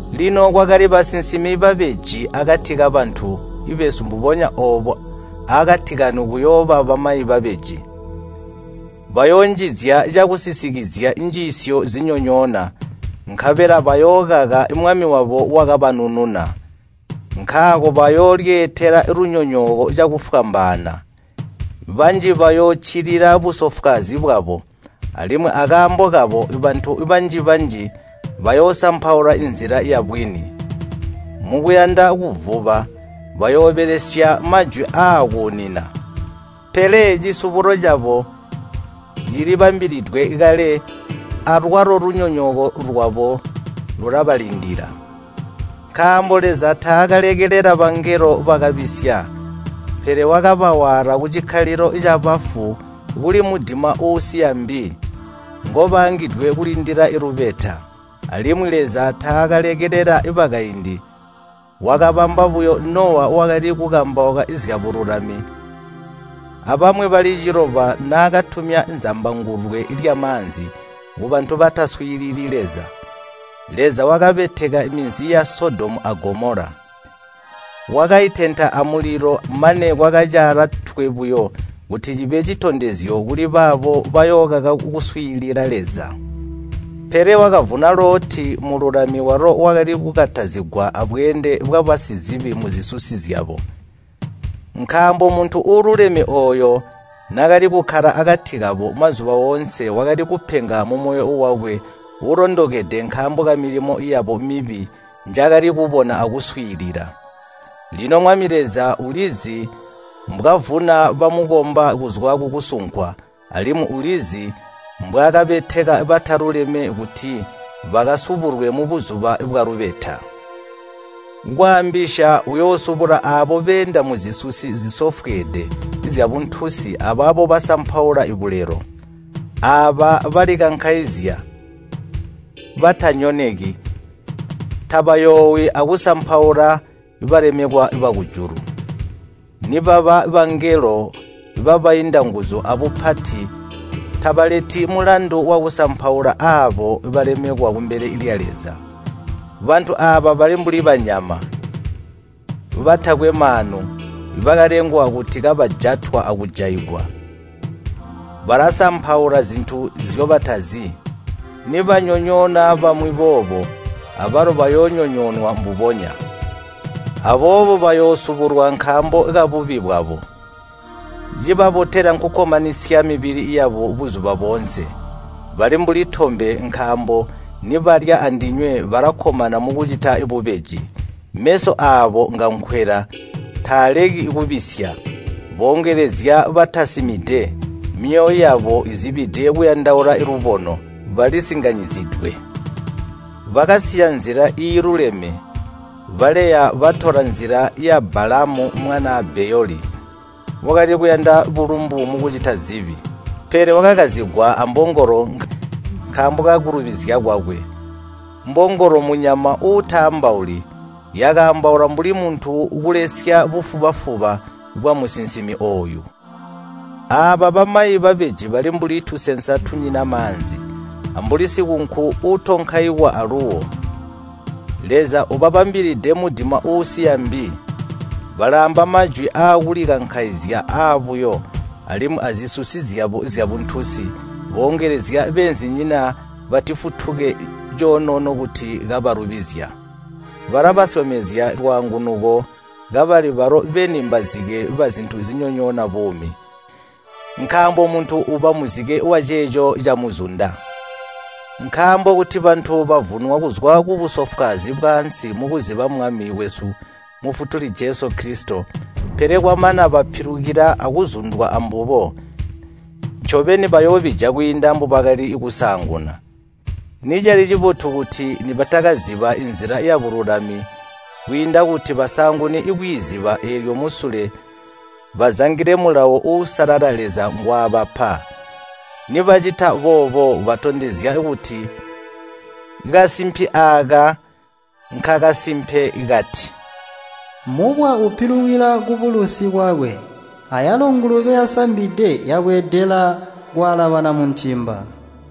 Lino kwakali basinsimi babeji akati kabantu besu mbubonya oobo aakati kanu kuyooba bamayi babeji. Bayoonjizya cakusisikizya njiisyo zinyonyoona, nkabela bayookaka Mwami wabo wakabanununa. Nkaako bayoolyeetela lunyonyooko cakufwambaana. Banji bayooccilila busofwaazi bwabo, alimwi akaambo kabo bantu banji-banji bayoosampaula nzila yabwini. Mukuyanda kuvuba bayoobelesya majwi aakuunina. Pele cisubulo cabo cilibambilidwe kale alwalo lunyonyooko lwabo lulabalindila. Nkaambo Leza taakalekelela bangelo bakabisya, pele wakabawaala kucikkalilo cabafu kuli mudima uusiya mbi, nkobaangidwe kulindila lubeta. Alimwi Leza taakalekelela bakaindi, wakabamba buyo Nowa wakali kukambauka zyabululami abamwi bali ciloba naakatumya zambangulwe lyamaanzi kubantu bataswiilili Leza. Leza wakabeteka minzi ya Sodomu a Gomola. Wakaitenta amulilo mane kwakacaala twe buyo kuti cibe citondezyo kuli baabo bayookaka kuswiilila Leza. Pele wakavuna Loti mululami walo wakali kukatazigwa abweende bwabasizibi muzisusi zyabo. Nkaambo muntu uululeme ooyo naakali kukkala akati kabo, mazuba oonse wakali kupenga mumoyo wakwe uulondekede nkaambo kamilimo yabo mibi njaakali kubona akuswiilila. Lino Mwami Leza ulizi mbwavuna bamukomba kuzwa kukusunkwa, alimwi ulizi mbwaakabeteka bataluleme kuti bakasubulwe mubuzuba bwalubeta. Kwaambisya uyoosubula aabo beenda muzisusi zisofweede zyabuntunsi abaabo basampaula bulelo. Aaba balalikankaizya, tanyoneki, tabayoowi akusampaula balemekwa bakujulu. Nibaba bangelo babainda nguzu abupati tabaleti mulandu wakusampaula aabo balemekwa kumbele lya Leza. Bantu aaba bali mbuli banyama, batakwe maanu bakalengwa kuti kabajatwa akujaigwa. Balasampaula zintu nzyobatazi. Nibanyonyoona bamwi boobo, abalo bayoonyonyoonwa mbubonya. Aboobo bayoosubulwa nkaambo kabubi bwabo. Cibabotela nkukkomanisya mibili yabo buzuba boonse. Bali mbuli tombe nkaambo nibalya andinywe balakkomana mukucita bubeji. Meso aabo ngankwela taaleki kubisya. Boongelezya batasimide. Myoyo yabo izibide kuyandaula lubono. Balisinganyizidwe. Bakasiya nzila iiluleme, baleya batola nzila ya Baalamu mwanaa Beyoli, wakali kuyanda bulumbu mukucita zibi. Pele wakakazigwa ambongolo nkaambo kakulubizya kwakwe. Mbongolo mmunyama uutaambauli yakaambaula mbuli muntu kulesya bufuba-fuba bwamusinsimi ooyu. Aaba bamayi babeji bali mbuli tusensa tunyina maanzi, ambuli sikunku uutonkaikwa aluuwo. Leza ubabambilide mudima uusiya mbi. Balaamba majwi akulikankaizya, aabuyo, alimwi azisusi zyabo zyabuntunsi boongelezya beenzinyina batifutuke coonoono kuti kabalubizya. Balabasyomezya lwaangunuko kabali balo beni mbazike bazintu zinyonyoona buumi. Nkaambo muntu uba muzike waceeco camuzunda. Nkaambo kuti bantu bavunwa kuzwa kubusofwaazi bwaansi mukuziba Mwami wesu Mufutuli Jesu Kilisito, pele kwamana bapilukila akuzundwa ambubo, ncobeni bayoobija kwiinda mbubakali kusaanguna. Nicali cibotu kuti nibatakaziba nzila yabululami kwiinda kuti basaangune kwiiziba eelyo musule bazangile mulawo uusalala Leza ngwaabapa. Nibacita boobo, batondezya kuti kasimpi aaka nkakasimpe kati, “Mubwa upilikila kubulusi bwakwe” Ayalo “Ngulube yasambide yabweedela kwaalabana muntimba.”